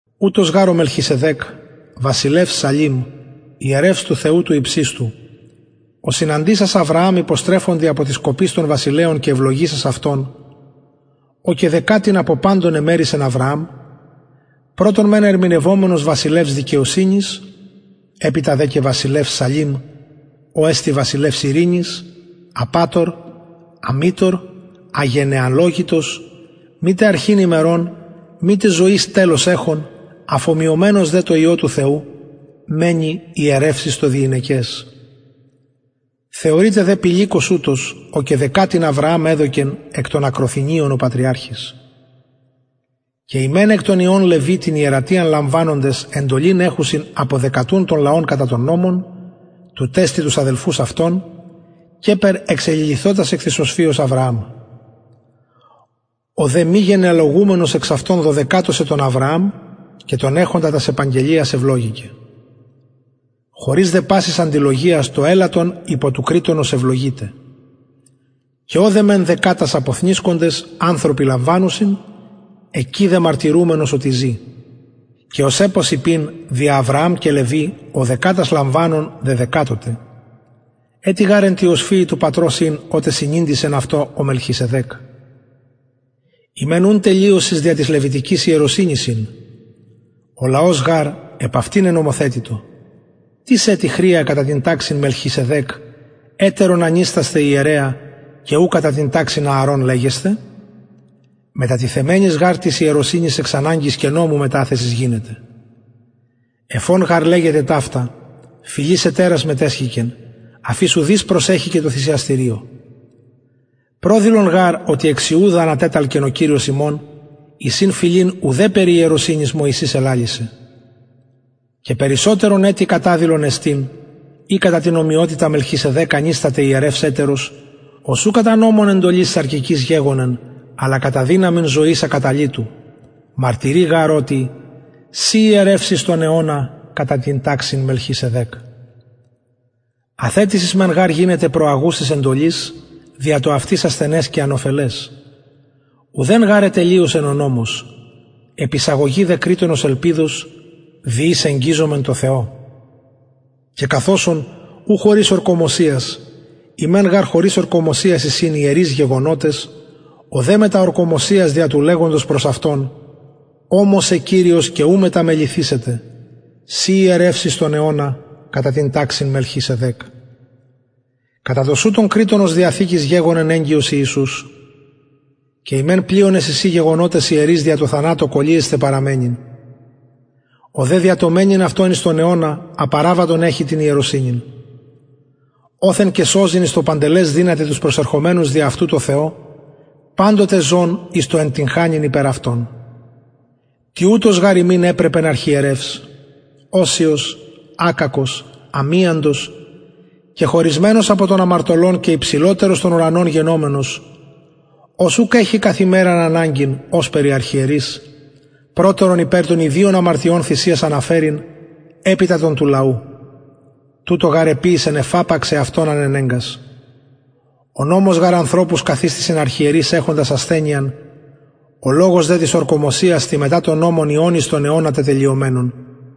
ουτος γαρ ο μελχισεδεκ βασιλευς σαλημ ιερευς του θεου του υψιστου ο συναντησας αβρααμ υποστρεφοντι απο της κοπης των βασιλεων και ευλογησας αυτον ω και δεκατην απο παντων εμερισεν αβρααμ πρωτον μεν ερμηνευομενος βασιλευς δικαιοσυνης επειτα δε και βασιλευς σαλημ ο εστιν βασιλευς ειρηνης απατωρ αμητωρ αγενεαλογητος μητε αρχην ημερων μητε ζωης τελος εχων αφωμοιωμενος δε τω υιω του θεου μενει ιερευς εις το διηνεκες θεωρειτε δε πηλικος ουτος ω και δεκατην αβρααμ εδωκεν εκ των ακροθινιων ο πατριαρχης και οι μεν εκ των υιων λευι την ιερατειαν λαμβανοντες εντολην εχουσιν αποδεκατουν τον λαον κατα τον νομον τουτ εστιν τους αδελφους αυτων καιπερ εξεληλυθοτας εκ της οσφυος αβρααμ ο δε μη γενεαλογουμενος εξ αυτων δεδεκατωκεν τον αβρααμ και τον εχοντα τας επαγγελιας ευλογηκεν χωρις δε πασης αντιλογιας το ελαττον υπο του κρειττονος ευλογειται και ωδε μεν δεκατας αποθνησκοντες ανθρωποι λαμβανουσιν εκει δε μαρτυρουμενος οτι ζη και ως επος ειπειν δια αβρααμ και λευι ο δεκατας λαμβανων δεδεκατωται ετι γαρ εν τη οσφυι του πατρος ην οτε συνηντησεν αυτω ο μελχισεδεκ ει μεν ουν τελειωσις δια της λευιτικης ιερωσυνης ην ο λαος γαρ επ αυτη νενομοθετητο τις ετι χρεια κατα την ταξιν μελχισεδεκ ετερον ανιστασθαι ιερεα και ου κατα την ταξιν ααρων λεγεσθαι μετατιθεμενης γαρ της ιερωσυνης εξ αναγκης και νομου μεταθεσις γινεται εφ ον γαρ λεγεται ταυτα φυλης ετερας μετεσχηκεν αφ ης ουδεις προσεσχηκεν τω θυσιαστηριω προδηλον γαρ οτι εξ ιουδα ανατεταλκεν ο κυριος ημων εις ην φυλην ουδεν περι ιερωσυνης μωυσης ελαλησεν και περισσοτερον ετι καταδηλον εστιν ει κατα την ομοιοτητα μελχισεδεκ ανισταται ιερευς ετερος ος ου κατα νομον εντολης σαρκικης γεγονεν αλλα κατα δυναμιν ζωης ακαταλυτου μαρτυρει γαρ οτι συ ιερευς εις τον αιωνα κατα την ταξιν μελχισεδεκ αθετησις μεν γαρ γινεται προαγουσης εντολης δια το αυτης ασθενες και ανωφελες ουδεν γαρ ετελειωσεν ο νομος επεισαγωγη δε κρειττονος ελπιδος δι ης εγγιζομεν τω θεω και καθ οσον ου χωρις ορκωμοσιας οι μεν γαρ χωρις ορκωμοσιας εισιν ιερεις γεγονοτες ο δε μετα ορκωμοσιας δια του λεγοντος προς αυτον ωμοσεν κυριος και ου μεταμεληθησεται συ ιερευς εις τον αιωνα κατα την ταξιν μελχισεδεκ κατα τοσουτον κρειττονος διαθηκης γεγονεν εγγυος ιησους και οι μεν πλειονες εισιν γεγονοτες ιερεις δια το θανατω κωλυεσθαι παραμενειν ο δε δια το μενειν αυτον εις τον αιωνα απαραβατον εχει την ιερωσυνην οθεν και σωζειν εις το παντελες δυναται τους προσερχομενους δι αυτου τω θεω παντοτε ζων εις το εντυγχανειν υπερ αυτων τοιουτος γαρ ημιν επρεπεν αρχιερευς οσιος ακακος αμιαντος κεχωρισμενος απο των αμαρτωλων και υψηλοτερος των ουρανων γενομενος ος ουκ εχει καθ ημεραν αναγκην ωσπερ οι αρχιερεις προτερον υπερ των ιδιων αμαρτιων θυσιας αναφερειν επειτα των του λαου τουτο γαρ εποιησεν εφαπαξ εαυτον ανενεγκας ο νομος γαρ ανθρωπους καθιστησιν αρχιερεις εχοντας ασθενειαν ο λογος δε της ορκωμοσιας της μετα τον νομον υιον εις τον αιωνα τετελειωμενον